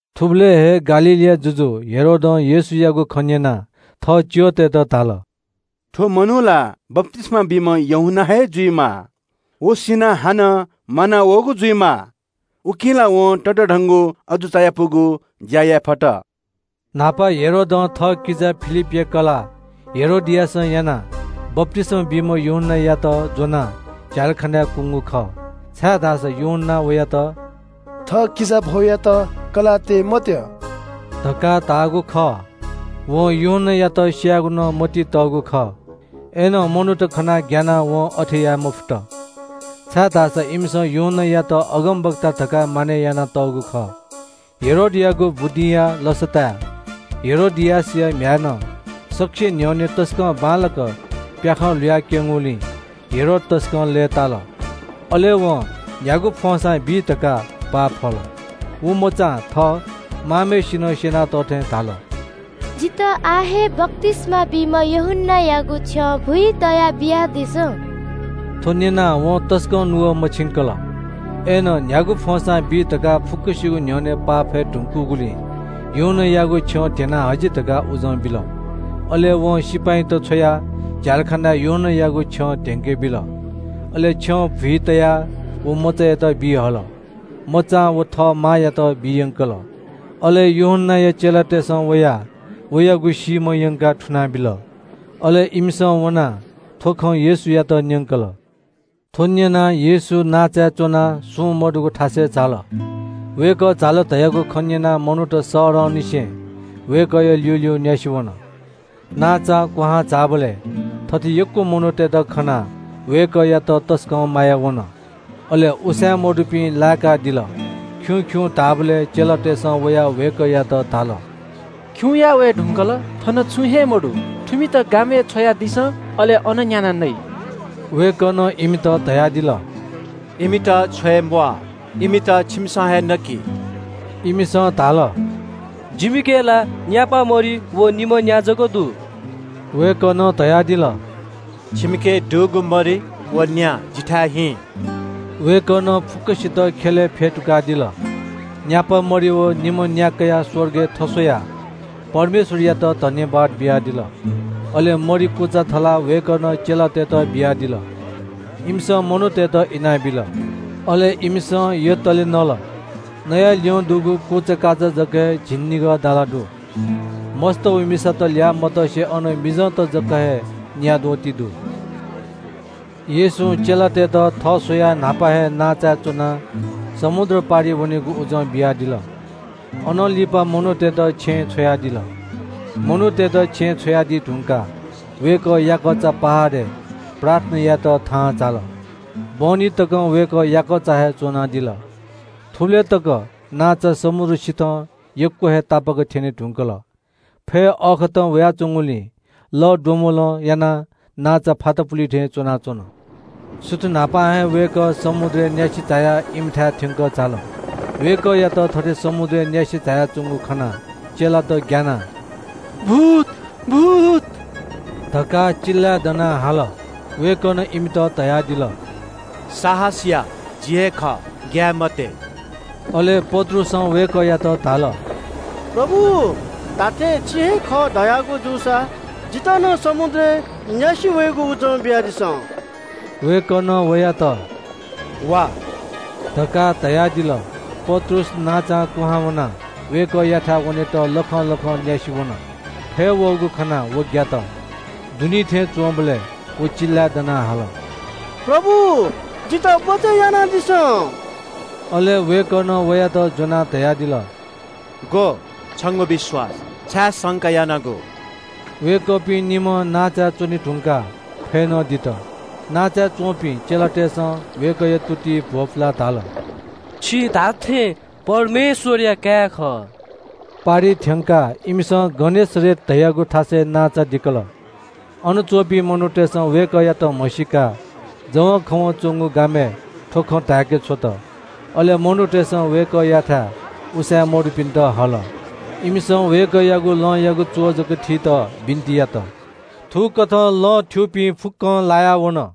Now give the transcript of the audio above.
थुबलय् हे गालीलया जुजु हेरोदं येशूयागु खँ न्‍यनाः थः भारदारतय्‌त धाल – “थ्‍व मनू ला बप्‍तिस्‍मा बीम्‍ह यूहन्‍ना हे जुइमाः। व सिनाः हानं म्‍वानावःगु जुइमाः, उकिं ला वं ततःधंगु अजू चायापुगु ज्‍या याये फत।” न्‍हापा हेरोदं थःकिजा फिलिपया कलाः हेरोदियासं यानाः बप्‍तिस्‍मा बीम्‍ह यूहन्‍नायात ज्‍वनाः झ्‍यालखानाय् कुंगु खः। छाय्‌धाःसा यूहन्‍नां वयात “थः किजाभौयात कलाः तये मत्‍यः” धकाः धाःगु खः। वं यूहन्‍नायात स्‍यायेगु नं मतिइ तःगु खः। अय्‌नं मनूत खनाः ग्‍यानाः वं अथे याये मफुत, छाय्‌धाःसा इमिसं यूहन्‍नायात अगमवक्ता धकाः मानय् यानातःगु खः। हेरोदयागु बुदिंया लसताय् हेरोदियासया म्‍ह्याय्‌नं सकसिया न्‍ह्यःने तसकं बांलाक प्‍याखं ल्‍हुयाक्‍यंगुलिं हेरोद तसकं लय्‌ताल। अले वं न्‍ह्यागु फ्‍वंसां बी धकाः पाफल। व मचां थः मांम्‍हय्‌सिनं स्‍यनातःथें धाल – “जितः आः हे बप्‍तिस्‍मा बीम्‍ह यूहन्‍नायागु छ्यं भुइ तयाः बियादिसँ।” थ्‍व न्‍यनाः वं तसकं नुगः मछिंकल, अय्‌नं न्‍ह्यागु फ्‍वंसां बी धकाः फुक्‍कसिगु न्‍ह्यःने पाफये धुंकूगुलिं यूहन्‍नायागु छ्यं ध्‍यनाः हजि धकाः उजं बिल। अले वं सिपाइँत छ्वयाः झ्‍यालखानाय् यूहन्‍नायागु छ्यं धेंके बिल। अले छ्यं भुइ तयाः व मचायात बी हल। मचां व थः मांयात बी यंकल। अले यूहन्‍नाया चेलातय्‌सं वयाः वयागु सीम्‍ह यंकाः थुनाबिल। अले इमिसं वनाः थ्‍व खँ येशूयात न्‍यंकल। थ्‍व न्‍यनाः येशू नांचाय् च्‍वनाः सुं मदुगु थासय् झाल। वय्‌कः झाल धयागु खँ न्‍यनाः मनूत शहरंनिसें वय्‌कःया ल्‍यूल्‍यू न्‍यासि वन। नांचां क्‍वहां झाःबलय् ग्‍वाः ग्‍वाः मनूतय्‌त खनाः वय्‌कःयात तसकं माया वन, अले उसाँय् मदुपिन्‍त लाय्‌कादिल। खिउँ खिउँ धाःबलय् चेलातय्‌सं वयाः वय्‌कःयात धाल – “खिउँया वये धुंकल, थन छुं हे मदु। थुमित गामय् छ्वयादिसँ। अले अन न्‍यानाः नइ।” वय्‌कलं इमित धयादिल – “इमित छ्वये म्‍वाः, इमित छिमिसं हे नकि।” इमिसं धाल – “जिमिके ला न्‍यापा मरि व निम्‍ह न्‍या जक दु।” वय्‌कलं धयादिल – “छिमिके दुगु मरि व न्‍या जिथाय् हिँ।” वय्‌कलं फुक्‍कसित ख्‍यलय् फ्‍यतुकादिल। न्‍यापा मरि व निम्‍ह न्‍या कयाः स्‍वर्गय् थस्‍वयाः परमेश्‍वरयात सुभाय् बियादिल। अले मरि कुचा थलाः वय्‌कलं चेलातय्‌त बियादिल। इमिसं मनूतय्‌त इनाबिल। अले इमिसं यतले नल। इनाः ल्‍यं दुगु झिंनिगः दाला जाय्‌क दु। मस्‍त व मिसात ल्‍याः मतसे अन मिजंत जक हे न्‍याद्वः ति दु। येशूं चेलातय्‌त थः स्‍वयाः न्‍हापा हे नांचाय् च्‍वनाः समुद्र पारि वनेगु उजं बियादिल। अनं लिपा मनूतय्‌त छेँय् छ्वयादिल। मनूतय्‌त छेँय् छ्वयादी धुंकाः वय्‌कः याकःचा पहाडय् प्रार्थना यायेत थाहां झाल। बहनी तकं वय्‌कः याकःचा हे च्‍वनादिल। थुबलय् तक नांचा समुद्र सिथं यक्‍व हे तापाक्‍क थ्‍यने धुंकल। फय् अःखतं वयाच्‍वंगुलिं लःद्वम्‍बलं यानाः नांचा फातापुली थें च्‍वनाच्‍वन। सुथ न्‍हापां हे वय्‌कः समुद्रय् न्‍यासि झायाः इमिथाय् थ्‍यंकः झाल। वय्‌कःयात थथे समुद्रय् न्‍यासि झायाच्‍वंगु खनाः चेलात ग्‍यानाः “भूत भूत” धकाः चिल्‍लाय् दनाः हाल। वय्‌कलं इमित धयादिल – “साहस या, जि हे खः, ग्‍याये मते।” अले पत्रुसं वय्‌कःयात धाल – “प्रभु, धात्‍थें छि हे खः धयागु जूसा जितः नं समुद्रय् न्‍यासि वयेगु उजं बियादिसँ।” वय्‌कलं वयात “वा” धकाः धयादिल। पत्रुस नांचां कुहां वनाः वय्‌कःयाथाय् वनेत लखं लखं न्‍यासि वन। फय् वःगु खनाः व ग्‍यात, दुनी थें च्‍वंबलय् व चिल्‍लाय् दनाः हाल – “प्रभु, जितः बचय् यानादिसँ।” अले वय्‌कलं वयात ज्‍वनाः धयादिल – “ग्‍व, छंगु विश्‍वास, छाय् संका यानागु?” वय्‌कःपिं निम्‍हं नांचाय् च्‍वने धुंकाः फय् नं दित। नांचाय् च्‍वंपिं चेलातय्‌सं वय्‌कःया तुतिइ भ्‍वपुलाः धाल – “छि धात्‍थें परमेश्‍वरया काय् खः।” पारिइ थ्‍यंकाः इमिसं गनेसरेत धाःगु थासय् नांचा दिकल। अन च्‍वंपिं मनूतय्‌सं वय्‌कःयात म्‍हसीकाः जवंखवं च्‍वंगु गामय् थ्‍व खँ धाय्‌के छ्वत। अले मनूतय्‌सं वय्‌कःयाथाय् उसाँय् मदुपिन्‍त हल। इमिसं वय्‌कःयागु लंयागु च्‍वः जक थीत बिन्‍ति यात। थुकथं लं थ्‍यूपिं फुक्‍कं लाया वन।